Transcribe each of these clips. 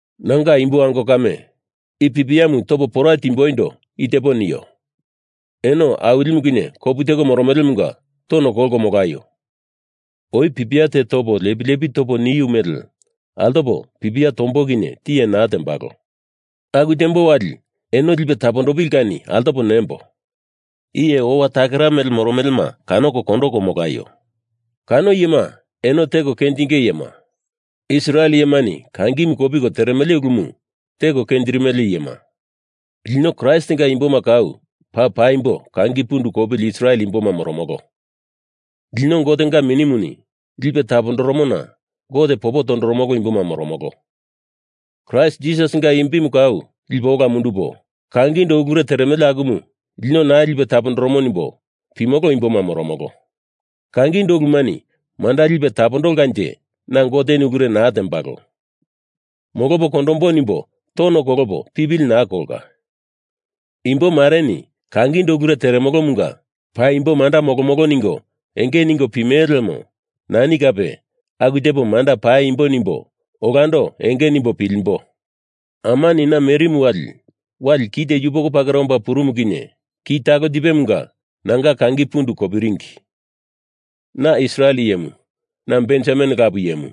Nanga imbo ango kame, i pipiamu topo pora timboindo i tepo nio: Eno Awilimu kinye kopu teko moromelemunga tono kolko molaio. Oi pipia te topo lepi lepi topo niu mele altopo pipia tombo kinye tiye naa tembalo. Aku tembo wali eno lipe tapondopili kani altopo nembo, Iye owa takera mele moromelema kanoko kondoko molaio. Kano iyema eno teko kenjinge iyema, Israel iyemani kangimu kopiko teremele ulumu teko kenjirimele iyema. Lino Kraistinga imboma kau paa paimbo kangi pundu kopili Israel imboma moromolo. Lino Gotenga Minimuni lipe tapondoromona Gote popo toromolo imboma moromolo. Kraist Jisasinga imbimu kau lipo ola mundupo, kangindo ulure teremele akumu lino naa lipe tapondoromo nimbo pimolo imboma moromolo. Kangindo ulumani manda lipe tapondolkanje na Goteni ulure naa tembalo. Molopo kondombo nimbo tono kolopo pipili naa kolka. Imbo mareni kangindo ulure teremolomunga paimbo manda molomolo ningo enge ningo pimele lemo nani kape aku tepo manda paimbo nimbo olando enge nimbo pilimboi. Amani na merimu wali wali kite yupoko pakera omba purumu kinye ki talo tipemunga nanga kangi pundu kopiringi. Na Israel iyemu, na Benjamin lapu iyemu;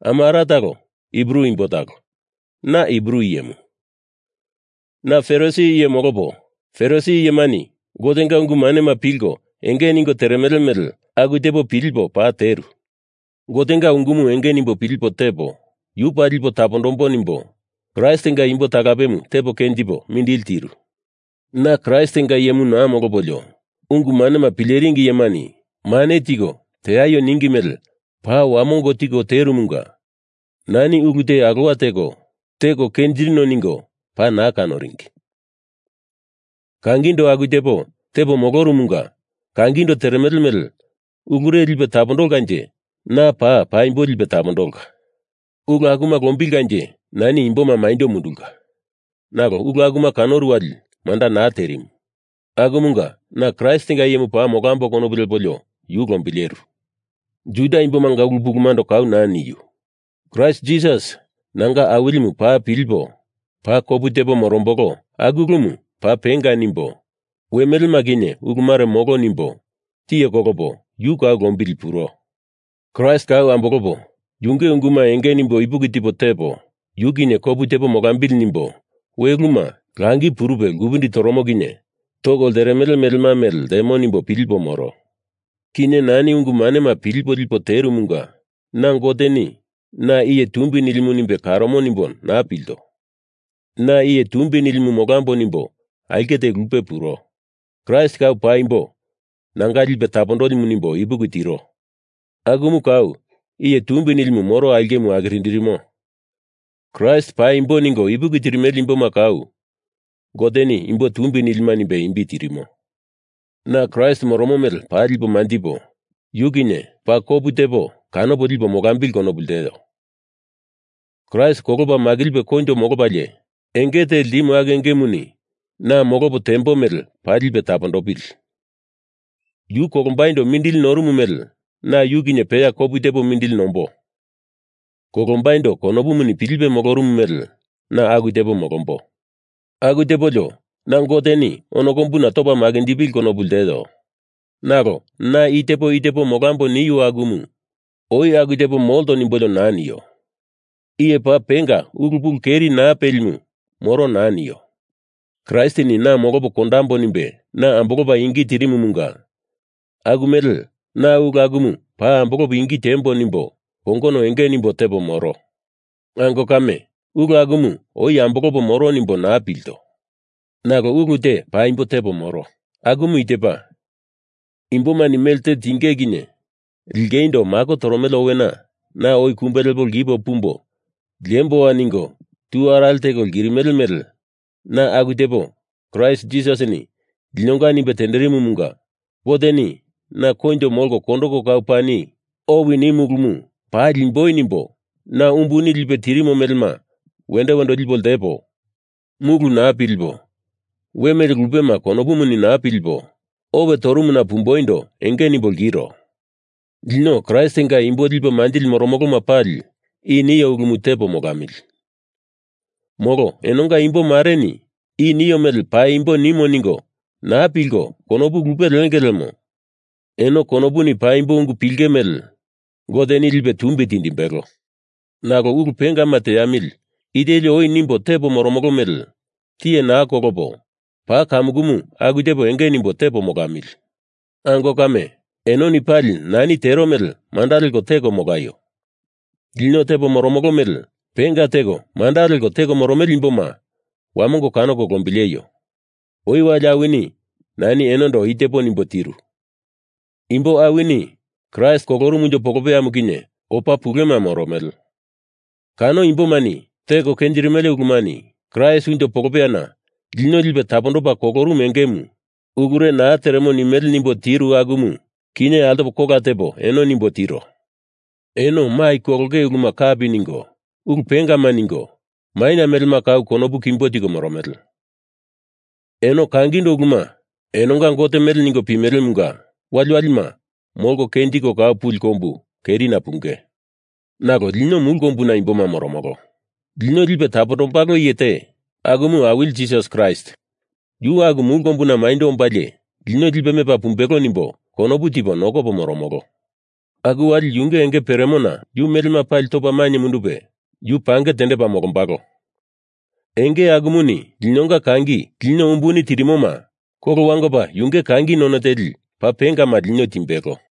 ama ara talo Hibru imbo talo, na Hibru iyemu. Na Farisi iye molopo Farisi iyemani Gotenga ungu manema pilko enge ningo teremele mele aku tepo pilipo paa teru. Gotenga ungumu enge nimbo pilipo tepo, yu paa lipo tapondambo nimbo Kraistinga imbo talapemu tepo kenjipo mindili tiru. Na Kraistinga iyemu naa molopolio ungu manema pileringi iyemani mane tiko teaio ningi mele paa wamongo tipo terumunga nani ulu te alowa teko, teko kenjirino ningo paa naa kanoringi. Kangindo aku tepo tepo molorumunga kangindo teremele mele ulure lipe tapondolkanje na paa paimbo lipe tapondolka. Ulu akuma lombilkanje nani imboma maindo mundulka. Nalo ulu akuma kanoro wali manda naa terimu. Akumunga na Kraistinga iyemu paa molamboi konopu lepolio yu lombileru. Juda imbomanga ulu pulumando kau naa niu. Kraist Jisas nanga Awilimu paa pilipo paa kopu tepo morombolo aku ulumu paa penga nimbo we melema kinye uluma ulure molo nimbo tiye kolopo yu kau lombilipuro. Kraist kau ambolopo yunge unguma enge nimbo ipuki tipo tepo, yu kinye kopu tepo molambili nimbo we uluma langi purupe lkupindi toromo kinye toko lteremele melema mele ltemo nimbo pilipo moro. Kinye nani ungu manema pilipo lipo terumunga na Goteni na iye tumbi nilimu nimbe karomo nimbo naa pilto. Na iye tumbi nilimu molambo nimbo aulke te lupe puro. Kraist kau paimbo nanga lipe tapondolimu nimbo ipuki tiro akumu kau iye tumbi nilimu moro aulkemu akirindirimo. Kraist paimbo ningo ipuki tirimele imboma kau Goteni imbo tumbi nilima nimbe imbi tirimo. Na Kraist moromo mele paa lipo manjipo, yu kinye paa kopu tepo kanopo lipo molambili konopu lteo. Kraist kolopa makilipe koinjo molopalie enge te ltimu aku engemuni na molopo tembo mele paa lipe tapondopili. Yu kolombaindo mindili norumu mele na yu kinye peya kopu tepo mindili nombo. Kolombaindo konopuni pilipe molorumu mele na aku tepo molomboi. Aku tepolio na Goteni ono kombuna topa makinjipili konopu lteo. Nalo na i tepo i tepo molambo niu akumu oi aku tepo molto nimbolio naa nio. Iye paa penga ulu pulu keri naa pelimu moro naa nio. Kraistini na molopo kondambo nimbe na ambolopa ingi tirimumunga aku mele na ulu akumu paa ambolopo ingi tiembo nimbo kongono enge nimbo tepo moro. Ango kame, ulu akumu oi ambolopo moro nimbo naa pilto. Nalo ulu te paimbo tepo moro, akumu i tepa imbomani melte tinge kinye lingeindo mako toromele owena na oi kumbe lepo lkipo pumbo liemboa ningo tu arale teko lkirimele mele na aku tepo Kraist Jisasini linonga nimbe tenderimumunga Goteni na koinjo molko kondoko kau pani owi nimu ulumu paa liemboi nimbo na umbuni lipe tirimo melema wendo wendo lipo ltepo, mulu naa pilipo we mele lupema konopuni naa pilipo owe torumuna pumboindo enge nimbo lkiro. Lino Kraistinga imbo lipe manjili moromoloma pali i nio ulumu tepo molamili. Molo enonga imbo mareni i nio mele paimbo nimo ningo naa pilko konopu lupe lienge lemo eno konopuni paimbo ungu pilenge mele Goteni lipe tumbi tindimbelo. Nalo ulu pengama teamili i teli oi nimbo tepo moromolo mele tiye naa kolopo paa kamukumu aku tepo enge nimbo tepo molamili. Ango kame, enoni pali nani tero mele manda leko teko molaio. Lino tepo moromolo mele penga teko manda leko teko moromele imboma wamongo kanoko lombileio. Oi wali awini nani enondo i tepo nimbo tiru. Imbo awini Kraist kolorumu unjo polopeyamu kinye opa pulema moromele. Kano imbomani teko kenjirimele ulumani Kraist unjo polopeyana lino lipe tapondopa kolorumu engemu ulure naa teremo nimele nimbo tiru akumu kinye altopo kola tepo eno nimbo tiro. Eno mai kolonge uluma kapi ningo ulu pengama ningo, maina melema kau konopu kimbo tiko moromele. Eno kangindo uluma enonga Gote mele ningo pimelemunga waliwalima molko kenjiko kau puli kombu kerina punge. Nalo lino mulu kombuna imboma moromolo. Lino Lipe Tapondombalo Iye te, akumu Awili Jisas Kraist, yu aku mulu kombuna maindo ombalie lino lipe mepa pumbelo nimbo konopu tipo nokopo moromolo. Aku wali yunge enge peremona yu melema pali topa mainye mundupe yu pange tendepa molombalo. Enge akumuni linonga kangi lino umbuni tirimoma kolo wangopa yunge kangi none teli paa pengama lino timbelo.